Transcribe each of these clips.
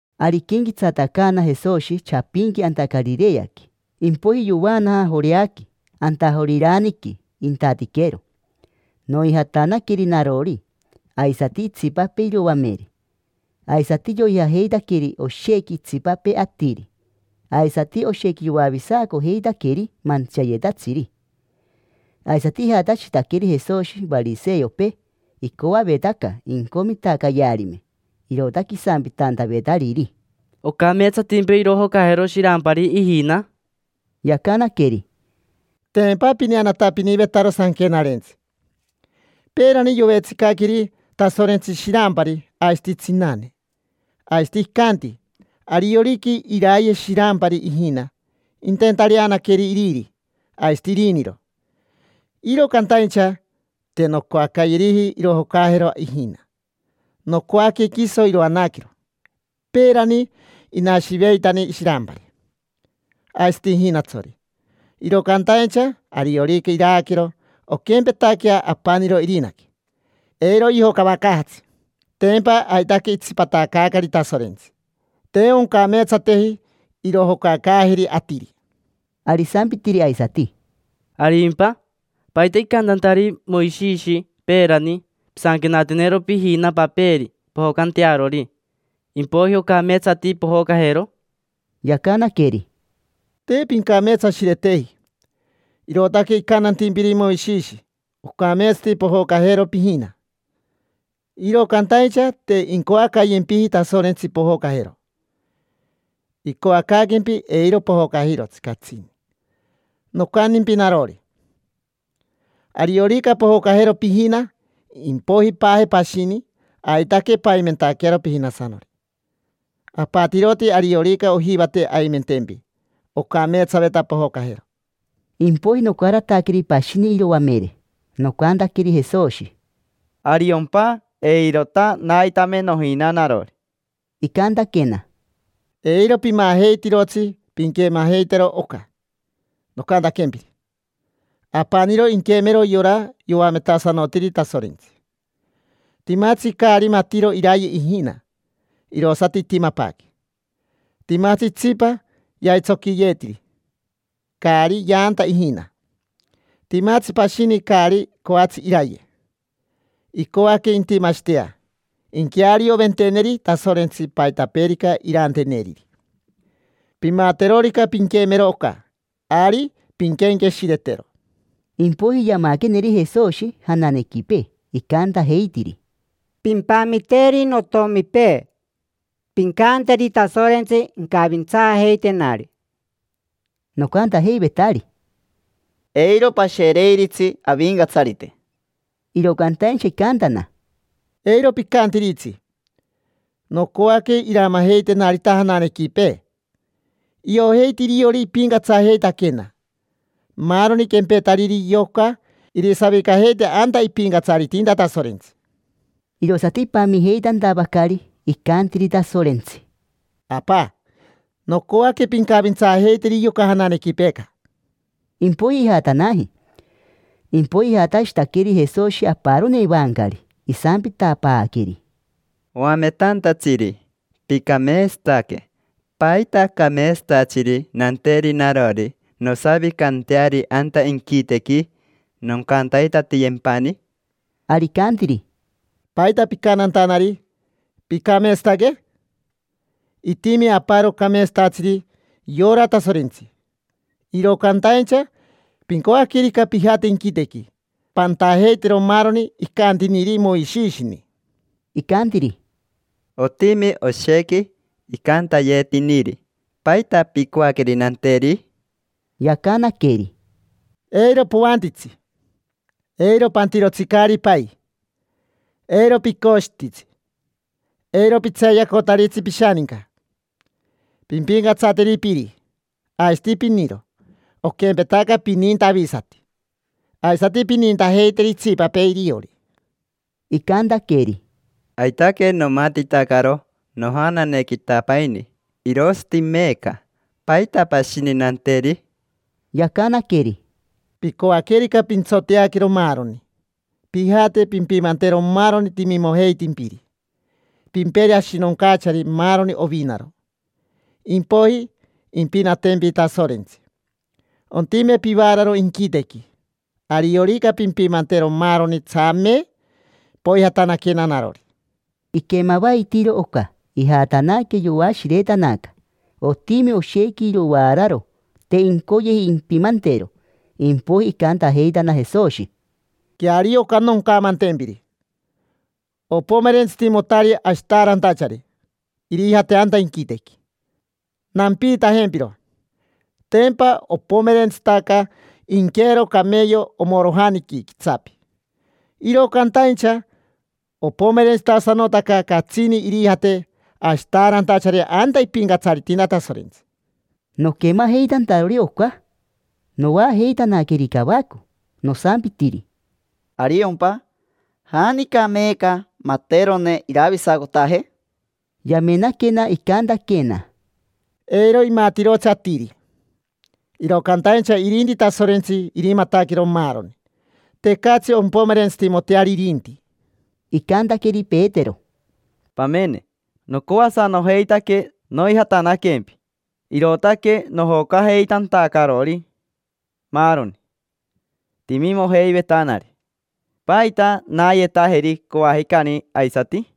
Ari iquenquetsatacaana Jesoshi chapinqui anta Carireaqui. Impoiji yovaanaja Joreaqui, anta Joriraniqui intatiquero. Noijatanaqueri narori, aisati itsipapee iroamere. Aisati yoijajeitaqueri oshequi itsipapee atiri. Aisati oshequi yoavisacojeitaqueri mantsiayetatsiri. Aisati ijatashitaqueri Jesoshi variseopee. Icoavetaca incomitacayearime, irootaque isampitantavetariri: —¿Ocameetsatimpa irojocajero shirampari ijina? Yacanaqueri: —Tempa pineanatapinivetaro Sanquenarentsi. Peerani yovetsicaqueri Tasorentsi shirampari aisati tsinane, aisati icanti: “Ariorica irayero shirampari ijina, inteentareanaqueri iriri aisati iriniro, iro cantaincha te noncoacayeriji irojocajero ijina. Nocoaque quiso iroanaquero. Peerani inashiveitani shirampari aisati ijinatsori, iro cantaincha ariorica iraaquero, onquempetaquea apaniro irinaque, eiro yojocavacaajatsi”. Tempa aitaque itsipatacaacari Tasorentsi, te oncameetsateji irojocacaajeri atiri. Ari isampitiri aisati: —¿Arimpa? ¿Paita icantantariri Moishishi peerani: “Pisanquenatenero pijina paperi pojocantearori, impoiji ocameetsati pojocajero”? Yacanaqueri: —Te pincameetsashireteji, irootaque icantantimpiri Moishishi ocameetsati pojocajero pijina. Iro cantaincha te incoacayempiji Tasorentsi pojocajero. Icoacaaquempi eiro pojocajirotsi catsini. Nocantimpi narori, ariorica pojocajero pijina impoiji paaje pashini, aitaque paimentaquearo pijinasanori. Apatiroti ariorica ojivate aimentempi, ocameetsaveta pojocajero. Impoiji, nocarataqueri pashini iroamere, nocantaqueri Jesoshi: —Ariompa, jaata eirota naitame nojina narori. Icantaquena: —Eiro pimajeitirotsi pinquemajeitero oca nocantaquempiri. Apaniro inquemero yora yoametasanotiri Tasorentsi. Timatsi caari matiro iraye ijina: irosati itimapaaque. Timatsi itsipa yaitsoquiyeetiri, caari yaanta ijina. Timatsi pashini caari coatsi iraye. Icoaque intimashitea inquearioventeneri Tasorentsi paitapeerica iranteneriri. Pimaterorica pinquemero oca, ari pinquenqueshiretero. Impoiji yamaqueneri Jesoshi jananequipee, icantajeitiri: —Pimpamiteri notomipee, pincanteri Tasorentsi incavintsaajeitenari. Nocantajeivetari: —Eiro pashereiritsi Avincatsarite. Iro cantaincha icantana: —Eiro picantiritsi: nocoaque iramajeitenarita jananequipee. Iojeiti iriori ipincatsajeitaquena. Maaroni quempetariri yoca irisavicajeite anta ipincatsaritinta Tasorentsi. Irosati ipamijeitantavacari, icantiri Tasorentsi: —Apa, nocoaque pincavintsaajeiteri yoca jananequipeeca. Impoiji ijatanaji. Impoiji ijatashitaqueri Jesoshi aparoni evancari, isampitapaaqueri: —Oametantatsiri, picameetsataque. ¿Paita cameetsatatsiri nanteri narori nosavicanteari anta inquitequi, noncantaitatiyempani? Ari icantiri: —¿Paita picantantanari: “Picameetsataque”? Itimi aparo cameetsatatsiri: yora Tasorentsi. Iro cantaincha pincoaquerica pijate inquitequi, pantajeitero maaroni icantiniri Moishishini. Icantiri: —Otimi oshequi icantayetiniri: ¿paita picoaqueri nanteri? Yacanaqueri: —Eiro poantitsi, eiro pantirotsi caari pai, eiro picoshititsi, eiro pitseeyacotaritsi pishaninca, pimpincatsateri piri aisati piniro; oquempetaca pininta avisati, aisati pinintajeiteri itsipapee iriori. Icantaqueri: —Aitaque nomatitacaro nojananequitapaini, irosati meeca. ¿Paita pashini nanteri? Yacanaqueri: —Picoaquerica pintsoteaquero maaroni, pijate pimpimantero maaroni timimojeitimpiri, pimperi ashinoncachari maaroni ovinaro; impoiji impinatempi Tasorentsi, ontime pivaararo inquitequi. Ariorica pimpimantero maaroni, tsame poijatanaquena narori. Iquemavaitiiro oca, ijatanaque, yoashiretanaca. Otimi oshequi irovaararo, te incoyeji impimantero. Impoiji icantajeitana Jesoshi: —Queario oca noncamantempiri: opomerentsitimotari ashitaarantachari irijate anta inquitequi. Nampiitajempiro: tempa opomerentsitaca inqueero cameyo omorojaniqui quitsapi. Iro cantaincha opomerentsitasanotaca catsini irijate ashitaarantachari anta ipincatsaritinta Tasorentsi. Noquemajeitantarori oca noajeitanaqueri cavaco. Nosampitiri: —¿Ariompa? ¿Janica meeca materone iravisacotaje? Yamenaquena, icantaquena: —Eiro imatirotsi atiri, iro cantaincha irinti Tasorentsi irimataquero maaroni. Tecatsi ompomerentsitimoteari irinti. Icantaqueri Petero: —Pamene, nocoasanojeitaque noijatanaquempi, irootaque nojocajeitantacarori maaroni timimojeivetanari. ¿Paita naayetajeri coajicani aisati?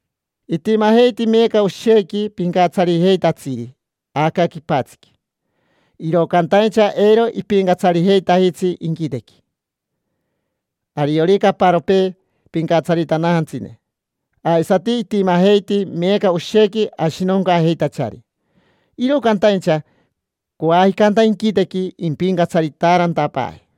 Itimajeiti meeca oshequi pincatsarijeitatsiri aca quipatsiqui, iro cantaincha eiro ipincatsarijeitajitsi inquitequi: ariorica aparopee pincatsaritanajantsine. Aisati itimajeiti meeca oshequi ashinoncaajeitachari, iro cantaincha coajica anta inquitequi impincatsaritaarantapaaje.